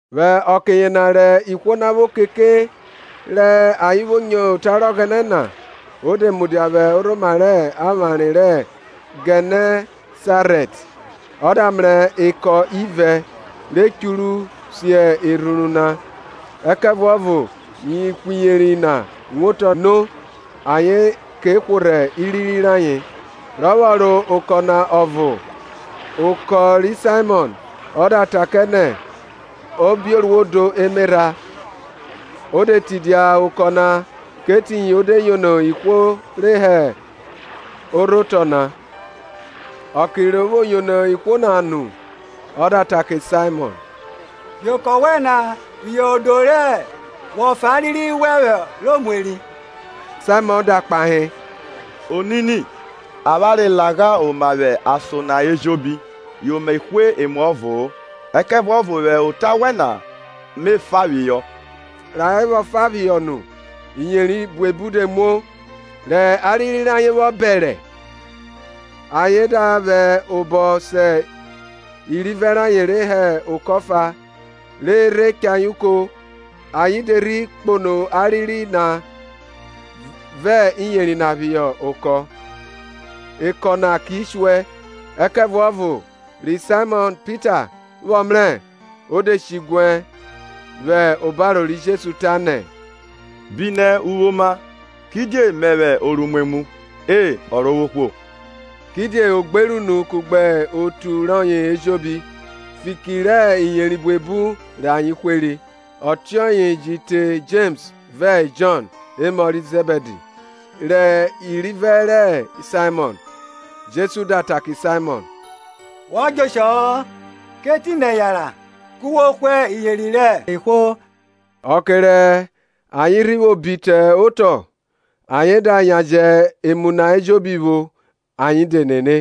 Vwẹ ọke yena rẹ ihwo na vwo keke re ayen nyo ota rẹ Ọghẹnẹ na, o de mudia vwẹ orhoma rẹ avware ri Gẹnẹsarẹt. Ọ da mrẹ eko ivẹ re churu si erhuru na, ẹkẹvuọvo ihwiyeri na wotọ no ayen ke hworhẹ iriri rayen. Rọ vwọ ro okọ na ọvo, okọ, ri Saimọn, ọ da ta kẹ nẹ o bio ro odo emerha. O de tidia okọ na kẹ etiyin o de yono ihwo re hẹ orhotọ na. Ọke ro vwo yono ihwo na nu, ọ da ta kẹ Saimọn, Bi okọ wẹn na phihọ odo re wọ fa ariri wẹn họ ro mu eri. Saimọn da kpahe, Onini, avwanre lagha oma vwẹ ason na ejobi yi me hwe emuọvo-o! Ẹkẹvuọvo vwẹ ota wẹn na me fa phihọ. Rẹ ayen vwọ fa phihọ nu, iyeri buebu de muo; rẹ ariri rayen vwọ bẹrẹ, ayen da vwẹ obọ se irivẹ rayen re hẹ okọ ọfa, re a rhe cha ayen uko. Ayen de rhi kpono ariri na vẹ iyeri na phihọ eko, eko na ki shuẹ. Ẹkẹvuọvo ri Saimọn Pita vwọ mrẹ, o de she diguẹ vwẹ obaro ri Jesu, tanẹ, Bi nẹ uvwe oma, kidie mẹvwẹ oruimwemwu, E, Ọrovwohwo. Kidie o gbere unu, kugbe otu rọye ejobi, fiki rẹ iyeri buebu rẹ ayen hweri; ọtiọye ji te Jems vẹ Jọn, emọ ri Zẹbidi, rẹ irivẹ ri Saimọn. Jesu da ta kẹ Saimọn, Wọ djẹ oshọ-ọ; kẹ etinẹ yanran ku wo hwe iyeri rẹ ihwo. Ọke rẹ ayen rhi vwo bi te otọ, ayen da yan jẹ emu na ejobi vwo, ayen de nene.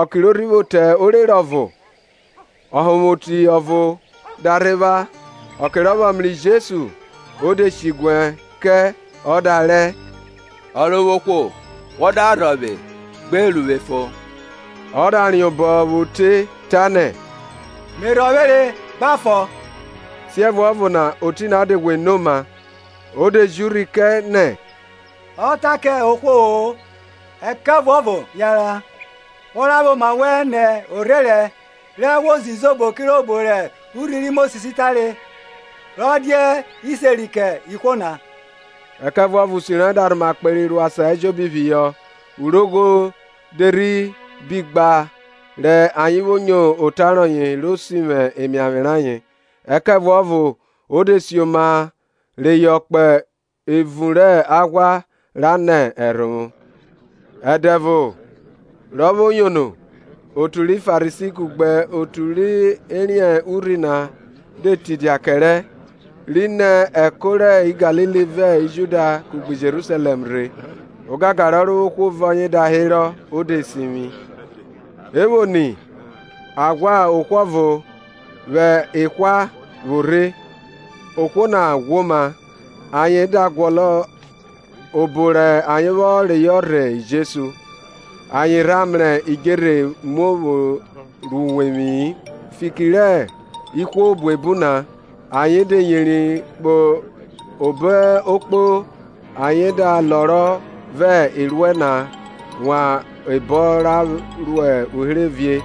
Ọke ro rhi vwo te orere ọvo, ọhonvwoti ọvo da rhe vwa; ọke rọ vwọ mrẹ Jesu, o de shiguẹ kẹ ọ da rẹ, Ọrovwohwo, wọ da rhọvwe gbe ru vwe fon. Ọ da riẹn obọ vwo te, tanẹ, Me rhọvwere; gba fon. Siẹvuọvo na oti na de ghwe no oma. O de ji urhi kẹ nẹ ọ ta kẹ ohwo-o; ẹkẹvuọvo yanran, wọ ra vwẹ oma wẹn nẹ orherẹn, rẹ wo ze izobo kirobo rẹ urhi ri Mosis tare, rọ dia iseri kẹ ihwo na. Ẹkẹvuọvo usi rọye da rhoma kperi ro asan ejobi phihọ; urogho de rhi bi gba re ayen nyo ota rọye ro sivwi emiavwe rayen. Ẹkẹvuọvo o de sioma reyọ kpo evun rẹ aghwa ra nẹ ẹrhovwo. Ẹdẹvo, ro vwo yono, otu ri Farisi kugbe otu re riẹn urhi de tidia kẹrẹ, ri nẹ ẹko ri Galili vẹ Judia kugbe Jerusalẹm rhe; ogangan rẹ Ọrovwohwo vẹ ọye da herọ, o de sivwi. E vwo ni, a ghwa ohwo ọvo vwẹ ahwa vwo rhe, ohwo na ghwoma, ayen da guọnọ obo rẹ ayen vwọ reyọ rhe Jesu; ayen rha mrẹ idjerhe muo ro uwevwi-i, fiki rẹ ihwo buebu na ayen de yeri kpo obo okpo ayen da lọrọ vẹ eruẹ na wan ebọn ra uherevie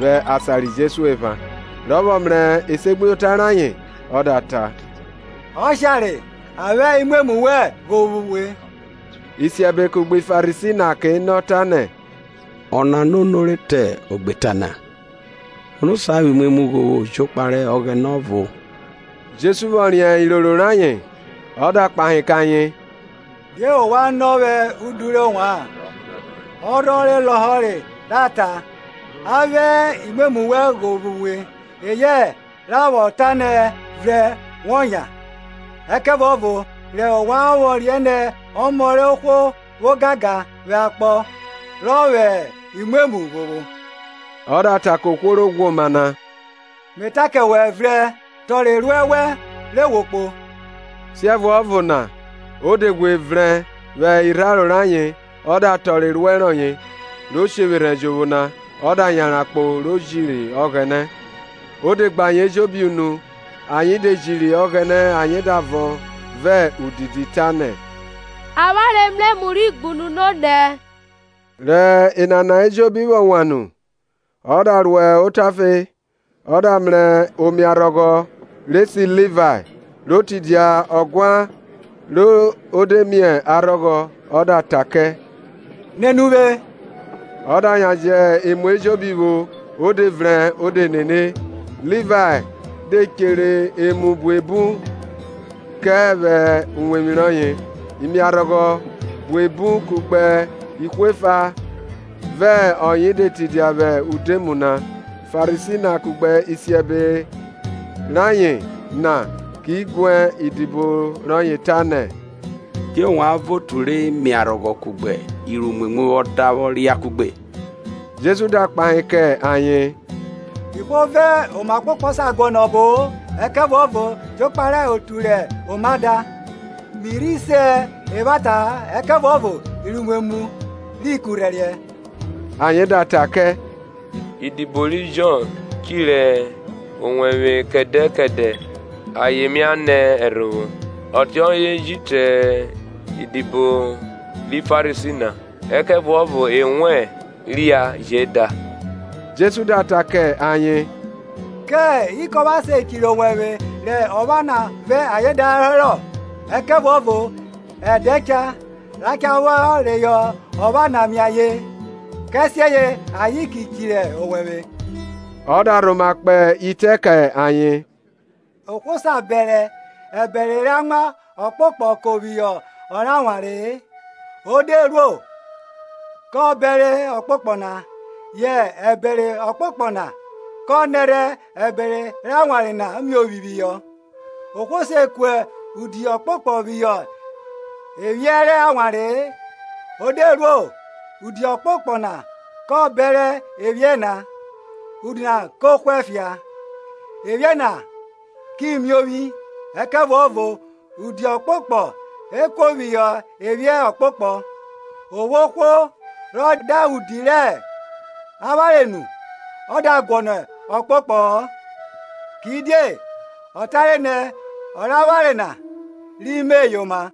vwẹ asan ri Jesu epha. Rọ vwọ mrẹ esegbuyota rayen ọ da ta, Ọshare; a vwẹ imwemwu wẹn ghovwo uwe. Isiẹbe kugbe Farisi na ke nọ, tanẹ, Ọna ono rọ ta ogbeta na? Ono sa vwẹ imwemwu ghovwo jokpa rẹ Ọghẹnẹ ọvo? Jesu vwọ riẹn iroro rayen, o da kpahe kẹ ayen, Die ovwan nọ vwẹ udu rẹ ovwan? Ọ rhọ lọhọre ra ta, A vwẹ imwemwu wẹn ghovwo uwe, eyẹ ra vwọ ta nẹ, Vrẹn wọ yan? Ẹkẹvuọvo re ovwan vwọ riẹn nẹ Ọmọ rẹ ohwo vwo ogangan vwẹ akpọ rọ vwọ vwẹ imwemwu ghovwo–o da ta kẹ ohwo ro ghwoma na–Me ta kẹ wẹ, vrẹn, tọrọ eruẹ wẹn re wo kpo. Siẹvuọvo na o de ghwe vrẹn vwẹ irharo rẹ ayen, ọ da tọrọ ernẹ rọye ro sherhẹ jovwo na, o da yanran kpo, jo jiri Ọghẹnẹ. Ọ de gbe ayen ejobi unu, ayen de jiri Ọghẹnẹ ayen da vọn vẹ udidi, tanẹ, Avwanre mrẹ emu ri gbunu nonẹ. Rẹ enana ejobi vwọ wan nu, ọ da ro otafe, ọ da mrẹ omiarhọghọ, re se Livae, ro tidia ọguan re de mie arhọghọ, ọ da ta kẹ Nene uvwe. Ọ da yan jẹ emu ejobi vwo, o de vrẹn, o de nene. Livae de ehere emu buebu kẹ vwẹ uwevwi rọye; imiarhọghọ, buebu kugbe ihwo efa vẹ ọye de tidia vwẹ udoemu na. Farisi na kugbe isiebe rayen na ki guẹ idibo rọye, tanẹ, Die ovwan vẹ otu rẹ imiarhọghọ kugbe iruimwemwu vwọ da vwọ ria kuẹgbe? Jesu da kpahe kẹ ayen, Ihwo vẹ oma ọkpokpọ sa guọnọ ọbo-o, ẹkẹvuọvo jokpa rẹ otu rẹ oma da. Mi rhi se evwata-a, ẹkẹvuọvo iruimwemwu ri kurhẹriẹ. Ayen da ta kẹ, Idibo ri Jọn ehirẹ owẹvwe kẹdẹ kẹdẹ ayen mia nẹ ẹrhovwo, ọtiọye ji te idibo ri Farisi na, ẹkẹvuọvo ewẹn ria je da. Jesu da ta kẹ ayen, Kẹ ikọpha se chiri owẹvwe rẹ ọpha na vẹ ayen da herọ? Ẹkẹvuọvo ẹdẹ cha, ra cha vwọ reyọ ọpha na mie ayen, kẹsiẹye ayen ki chiri owẹvwẹ. Ọ da rhoma kpe itẹ kẹ ayen, Ohwo sa bẹrẹ ẹbẹre rẹ amwa ọkpokpọ ko phihọ ọ rẹ awanre-e, o de ruo, kọ bẹre ọkpokpọ na, yẹ ẹbẹre ọkpokpọ na kọ nẹrhẹ ẹbẹre amwa rẹ awanre na miovwi phihọ. Ohwo se ku udi ọkpokpọ phihọ ephiẹ rẹ awanre-e; o de ruo, udi ọkpokpọ na ko bẹre ephiẹ na, udi na ko hwẹ fia, ephiẹ na ki miovwi. Ẹkẹvuọvo udi ọkpokpọ e kuo phihọ ephiẹ ọkpokpọ. O vwo ohwo rọ da udi rẹ awanre nu, ọ da guọnọ ọkpokpọ-ọ; kidie ọ tare nẹ, ọ rẹ awanre na ri me yoma.